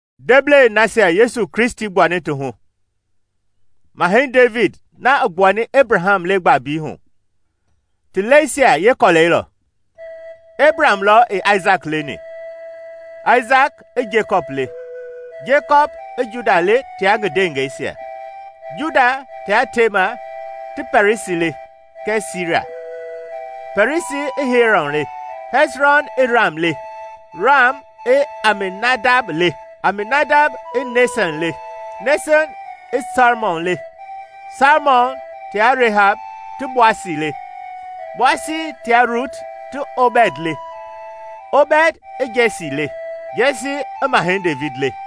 Ndeblei nasia Yesu Kristi gbuani ti hu, Mahɛi Devidi na i gbuani Ebraham le gbaambii hu, ti lɛisia yeekɔlɛi lɔ. Ebraham lɔ i Aisaki leni, Aisaki i Jekɔpi le, Jekɔpi i Juda le tia ngi ndewengeisia, Juda tia Tema ti Pɛrɛsi le kɛɛ Sira, Pɛrɛsi i Hɛsrɔn le, Hɛsrɔn i Ram le, Ram i Aminadab le, Aminadab i Naasɔn le, Naasɔn i Salmɔn le, Salmɔn tia Rehab ti Boasi le, Boasi tia Ruti ti Obɛd le, Obɛd i Jɛsi le, Jɛsi i Mahɛi Devidi le.